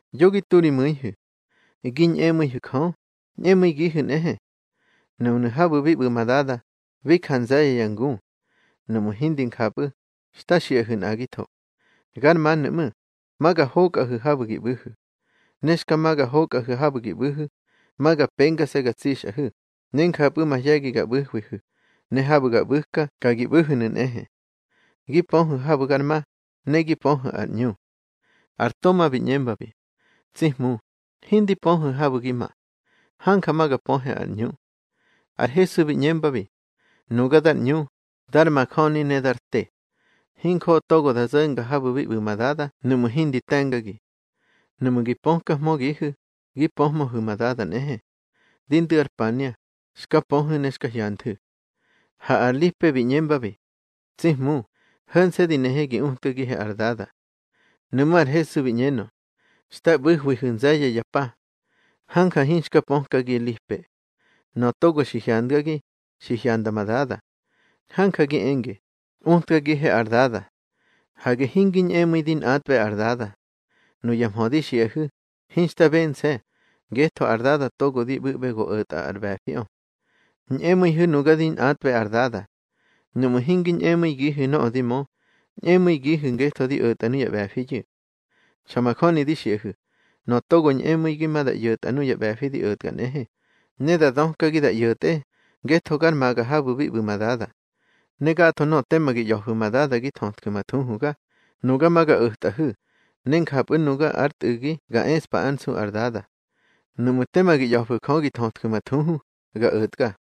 Yo gi tu ri mu̱ihu̱. Gi ñꞌemu̱ihu̱ Jö, ñꞌemu̱igihu̱ nꞌehe. Núnu̱ habu̱ bi ꞌbu̱ ma Dada, bi ja nze̱ye̱ ya ngu. Nuꞌmu̱ hindi njapꞌu̱, xta xiꞌahu̱ nꞌagitho. Gar manu̱ ꞌmu̱, ma ga hokꞌahu̱ habu̱ gi ꞌbu̱hu̱. Ne xka ma ga hokꞌahu̱ habu̱ gi ꞌbu̱hu̱, ma ga pengase̱ ga tsixꞌahu̱, ne njapꞌu̱ mahye̱gi ga ꞌbu̱huihu̱, ne habu̱ ga ꞌbu̱ka ka gi ꞌbu̱hu̱nu̱ nꞌehe. Gi pöhu̱ habu̱ gar ma, ne gi pöhu̱ ar ꞌñu. Ar Toma bi ꞌñembabi: —Tsi Hmu, hindi pöhe habu̱ gi ma. Hanja ma ga pöhe ar ꞌñu. Ar Hesu bi ꞌñembabi: —Nuga dar ꞌñu, dar majöni ne dar te. Hinjoꞌo togo da zo̱nga habu̱ bi ꞌbu̱ ma Dada nuꞌmu̱ hindi te̱ngagi. Nuꞌmu̱ gi pökahmögihu̱, gi pöhmöhu̱ ma Dada nꞌehe. Di ndu̱ ar pania, xka pöhu̱ ne xka hyanthu̱. Ha ar Lipe bi ꞌñembabi: —Tsi Hmu, ho̱nse̱ di nehe gi utkagihe ar Dada. Nuꞌmú̱ ar Hesu bi ꞌñenö: —Xta ꞌbu̱hwihu̱ nze̱ye̱ ya pa. Hanja hinxka pökagi, Lipe. Nöꞌö togo xi hyandgagi, xi hyanda ma Dada. Hanja gi enge: Utkagihe ar Dada. Hage hingi ñꞌemu̱i di nꞌatꞌbe ar Dada. Nuya mhö di xiꞌahu̱, hinxta bense̱, ngetho ar Dada togo di ꞌbu̱ꞌbe go o̱tꞌa ar ꞌbe̱fiꞌö. Ñꞌemu̱ihu̱ nuga di nꞌatꞌbe ar Dada. Nuꞌmu̱ hingi ñꞌemu̱igihu̱ nöꞌö di mö, ñꞌemu̱igihu̱ ngetho di o̱tꞌa nuya ꞌbe̱fiyu̱. Xa majöni di xiꞌahu̱, nöꞌö togo ñꞌemu̱igi ma da ꞌyo̱tꞌa nuya ꞌbe̱fi di o̱tka nꞌehe, ne da dökagi da ꞌyo̱tꞌe, ngetho gar maga habu̱ bi ꞌbu̱ ma Dada. Ne gatho nöꞌö tema gi ꞌya̱fu̱ ma Dada gi thötju̱ ma thuhuga, nuga ma ga o̱tꞌahu̱, ne njapꞌu̱ nuga ár Tꞌu̱gi ga eꞌspa ár nsu ar Dada. Nuꞌmu̱ tema gi ꞌya̱fu̱ Jö gi thötju̱ ma thuhu, ga o̱tga.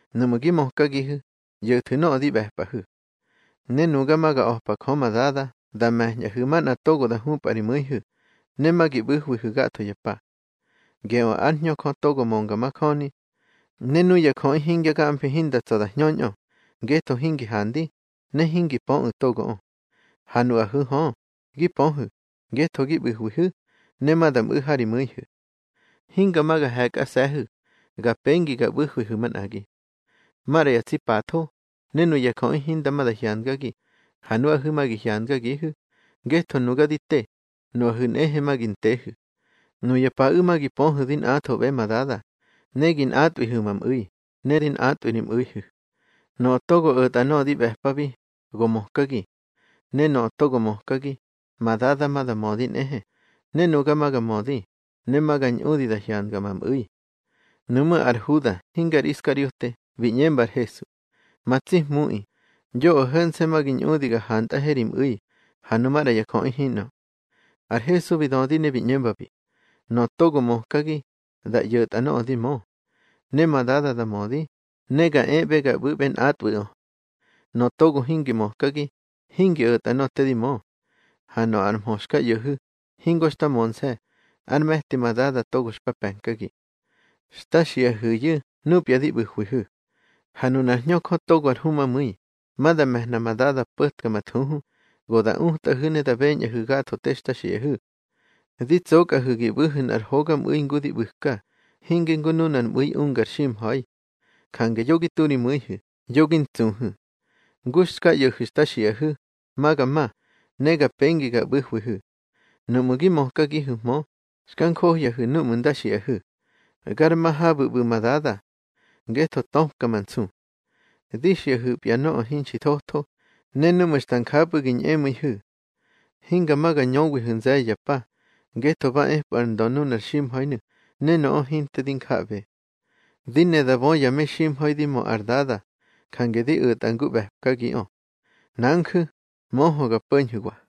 Nuꞌmu̱ gi mökagihu̱, ꞌyo̱thu̱ nöꞌö di ꞌbe̱pꞌahu̱. Ne nuga ma ga a̱pa Jö ma Dada da me̱ñꞌahu̱ manꞌa togo da hupꞌa ri mu̱ihu̱, ne ma gi ꞌbu̱hwihu̱ gatho ya pa. Geꞌö ár Hñö Jö togo mönga majöni. Ne nuya jöꞌi hingya gamfi hinda tsa̱ da hñöñꞌö, ngetho hingi handi, ne hingi pöꞌu̱ togoꞌö. Ha nuꞌahu̱ hö, gi pöhu̱, ngetho gi ꞌbu̱hwihu̱, ne ma da mꞌu̱ ha ri mu̱ihu̱. Hinga ma ga he̱kꞌase̱hu̱. Ga pengi ga ꞌbu̱hwihu̱ manꞌagi. Maꞌra ya tsi patho, ne nuya jöꞌi hinda ma da hyandgagi, ha nuꞌahu̱ ma gi hyandgagihu̱. Ngetho nuga di te, nuꞌahu̱ nꞌehe ma gi ntehu̱. Nuya paꞌu̱ ma gi pöhu̱ di nꞌathoꞌbe ma Dada, ne gi nꞌatꞌwihu̱ ma mꞌu̱i, ne di nꞌatꞌwi ri mꞌu̱ihu̱. Nöꞌö togo o̱tꞌa nöꞌö di ꞌbe̱pabi, go mökagi. Ne nöꞌö togo mökagi, ma Dada ma da mödi nꞌehe, ne nuga ma ga mödi, ne ma ga ñꞌudi da hyandga ma mꞌu̱i. Nuꞌmú̱ ar Huda (hinge ar Iskariote) bi ꞌñemba ar Hesu: —Ma tsi Hmuꞌi, yoꞌö ho̱nse̱ ma gi ñꞌudi ga hantꞌahe ri mꞌu̱i, ha nu maꞌra ya jöꞌi hinꞌö. Ar Hesu bi dödi ne bi ꞌñembabi: —Nöꞌö togo mökagi, da ꞌyo̱tꞌa nöꞌö di mö. Ne ma Dada da mödi, ne ga eꞌbe ga ꞌbu̱he nꞌatꞌwu̱ꞌö. Nöꞌö togo hingi mökagi, hingi o̱tꞌa nöꞌö te di mö. Ha nöꞌö ar mhö xka ꞌyo̱hu̱, hingo xta mönse̱, ár me̱ti ma Dada togo xpa pe̱nkagi. Xta xiꞌahu̱yu̱ núpya di ꞌbu̱hwihu̱. Ha nunár Hñö Jö togo ar Humamu̱i, ma da me̱hna ma Dada po̱tka ma thuhu, go da utꞌahu̱ ne da beñꞌahu̱ gatho te xta xiꞌahu̱. Di tsokꞌahu̱ gi ꞌbu̱hu̱ nꞌar hogamꞌu̱i ngu di ꞌbu̱ka, hinge ngu nunar mꞌu̱i unga ar ximha̱i. Jange yo gi tu ri mu̱ihu̱, yo gi ntsuhu̱. Ngu xka ꞌyo̱hu̱ xta xiꞌahu̱, ma ga ma, ne ga pengi ga ꞌbu̱hwihu̱. Nuꞌmu̱ gi mökhmöhu̱, xka njohyahu̱ núꞌmu̱ nda xiꞌahu̱: Gar ma habu̱ ꞌbu̱ ma Dada. Ngetho töpka ma nsu. Di xiꞌahu̱pya nöꞌö hinxi thotho, ne núꞌmu̱ xta njapꞌu̱ gi ñꞌemu̱ihu̱. Hinga ma ga ñöwihu̱ nze̱ye̱ ya pa, ngetho ba epꞌu̱ ár ndö nunar ximha̱inu̱, ne nöꞌö hinte di njaꞌbe. Di ne da bö ya meximha̱i di mö ar Dada, jange di o̱tꞌa ngu ꞌbe̱pkagiꞌö. Nanju̱, möhö ga po̱ñhu̱wa.